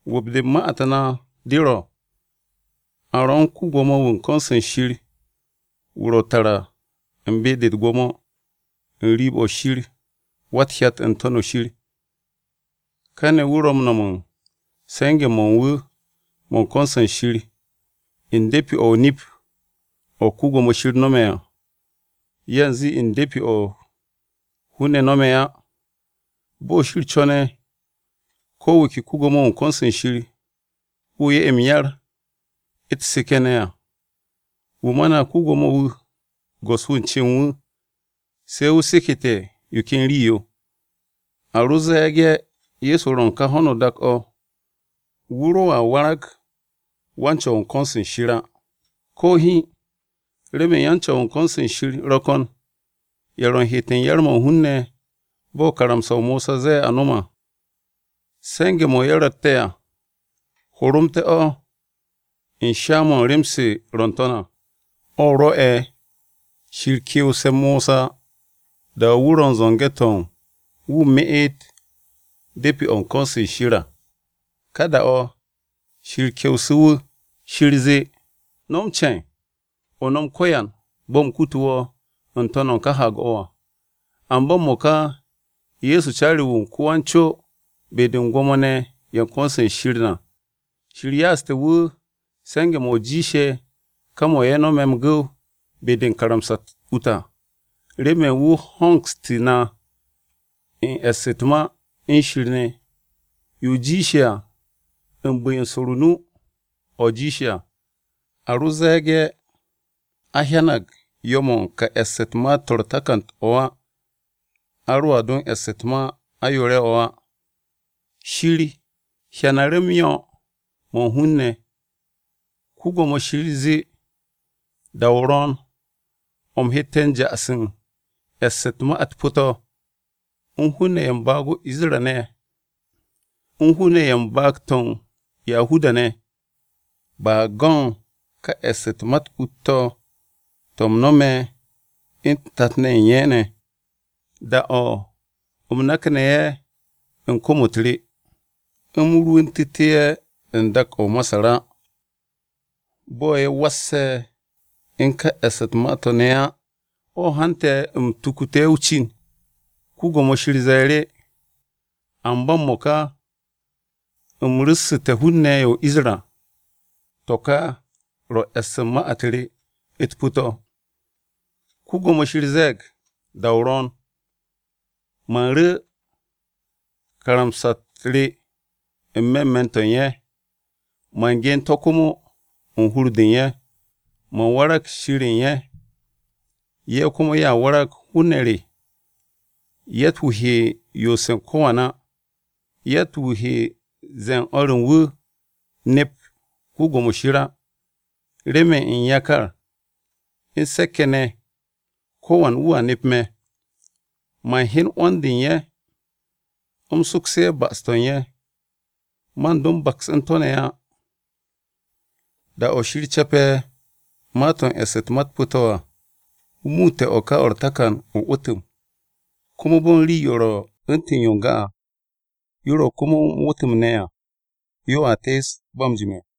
'Wu̱p-de u̱n ma-u̱t na de ro̱ a ro̱ u̱n ko-Gwo̱mo-wu̱ u̱n ko̱n-se Shir ne̱, wu̱ ro̱ tara u̱n be-de u̱t-gwo̱mo n-riib o̱ Shir Wa-u̱t-Hyat n-To̱n shir à. Kane̱ wu̱ ro̱ m-no̱m u̱n se̱nge̱-mo̱ u̱n wu̱ mo̱ u̱n ko̱n-se Shir u̱n de̱pi-o̱ o-nip o̱ Wan-Ko̱yan nome̱ à, yanze u̱n de̱pi-o̱ hun-ne̱ no̱me̱ á. Bo̱ Shir co̱ne̱ ko̱ wu̱ ke ko-Gwo̱mo-wu̱ u̱n ko̱n-se Shir, wu̱ 'ye m-yar u̱t-seke̱ ne̱ à. Wu̱ ma na ko-Gwo̱mo-wu̱ go̱s-wu̱ u̱n cen wu̱ se̱ wu̱ seke̱te̱ yo ken rii-yo. A ro ze̱e̱ge̱ Ye̱so ro̱ u̱n kà ho̱no o-dak o̱, wu̱ roa warag wan-Co̱w u̱n ko̱n-se Shir á, ko̱ hiin, remen yan-Co̱w u̱n ko̱n-se Shir ro̱ ko̱n ye̱ ro̱ u̱n heet u̱n yar-mo̱ u̱n hun-ne̱ bo̱ karamsa-o Mosa ze̱e̱ a no̱m à. Se̱nge̱-mo̱ ye̱ ro̱tte̱ à horomte̱-o̱ u̱n sha-mo̱ u̱n rem-se ro̱ n-to̱n à, o̱ rwo̱'e̱ Shir ke̱we̱ste̱ Mosa da-o̱ wu̱ ro u̱n zo̱nge̱-to̱ wu̱ meet de̱pi-o̱ u̱n ko̱n-se Shir à. Ka da-o̱ Shir kewsu̱ wu̱, Shir zee, “No̱m ce̱e̱n, o nom ko̱yan bo̱ u̱m kutu wo̱ n-to̱n u̱n ká haag-o̱ à.” Amba m-mo̱ka Ye̱so caari-wu̱ u̱n ko-wan-co be-de u̱n Gwo̱mo-ne̱ ye̱ u̱n ko̱n-se Shir na. Shir ya'aste̱ wu̱ se̱nge̱-mo̱ jiishe̱ ka mo̱ ye̱ nome̱ m-gu̱w be-de u̱n karamsa-u̱t ut à, remen wu̱ hongsu̱ na u̱n e̱ss u̱t-ma u̱n Shir ne̱. Yo jiishe̱ à u̱n bu̱-yo u̱n swo̱o̱ru̱ o-nu, o̱ jiishe̱ à. A ro ze̱e̱ge̱ a hyanag yo̱-mo̱ u̱n ká e̱ss u̱t-ma to̱ u̱r-takan to̱ á, a roa do e̱ss u̱t-ma o-ayoore̱-o̱ á. Shir hyanu̱ru̱ m-yo̱ mo̱ u̱n hun-ne̱, “Yawe zee, ‘Da-o ro̱o̱n o̱ u̱m hette̱ ja'as u̱n e̱ss u̱n ma-u̱t pu̱-to̱, u̱n hun-ne̱ ye̱ u̱n baag-to̱ o-Isra-ne̱, u̱n hun-ne̱ ye̱ u̱n baag-to̱ o-Yahuda-ne̱. Ba go̱ u̱n ka e̱ss u̱t-ma u̱t-ut to̱, to̱ u̱m nome̱ u̱n tat-ne̱ u̱n ye̱ ne̱, da-o̱ u̱m nakne̱ ye̱ u̱n kom-u̱t re, u̱m rwu̱ntu̱tu̱ ye̱ u̱n dak-o̱ o-Masar á. Bo̱ ye̱ wasse̱ u̱n ká e̱ss u̱t-ma to̱ ne̱ á, o̱ hante̱ u̱m tukutu̱ ye̱ o-cin. Yawe zee, amba m-mo̱ka u̱m ru̱ssu̱te̱ hun-ne̱ ye̱ o-Isra, To̱ kà ro̱ e̱ss u̱n ma-u̱t re u̱t-pu̱ to̱: Yawe ze̱e̱g da-o ro̱o̱n, man ru̱ karamsa-u̱t re n-me̱ me̱n-to̱ u̱n ye̱. Man gen to̱ komo u̱n hur-de u̱n ye̱. Man warag Shir o̱ u̱n ye̱, ye̱ komo ye̱a warag hun-ne̱ re. Yatt-wu̱ he yoose̱ u̱n ko̱wan á. Yatt-wu̱ he ze̱e̱ u̱n o̱r u̱n wu̱, “Nep Yawe” á. Remen u̱n yakar u̱n se̱k-ye̱ ne̱, ko̱wan wu̱a nep me̱. Man hyen 'wo̱n-de u̱n ye̱, u̱m sokse̱ ye̱ ba'as-to̱ u̱n ye̱. Man do m-baks u̱n to̱ ne̱ á.’” Da-o̱ Shir ce̱pe̱ ma-to̱ u̱n e̱ss u̱t-ma u̱t-pu̱ to̱ à, wu̱ muutte̱ o̱ ka o̱ u̱r-takan o-'wu̱tu̱m. Komo bo̱ u̱n rii-yo ro̱ u̱ntu̱n yo n-ga à, yo ro̱ komo m-wu̱tme̱ à, yoa tees ba m-jime̱.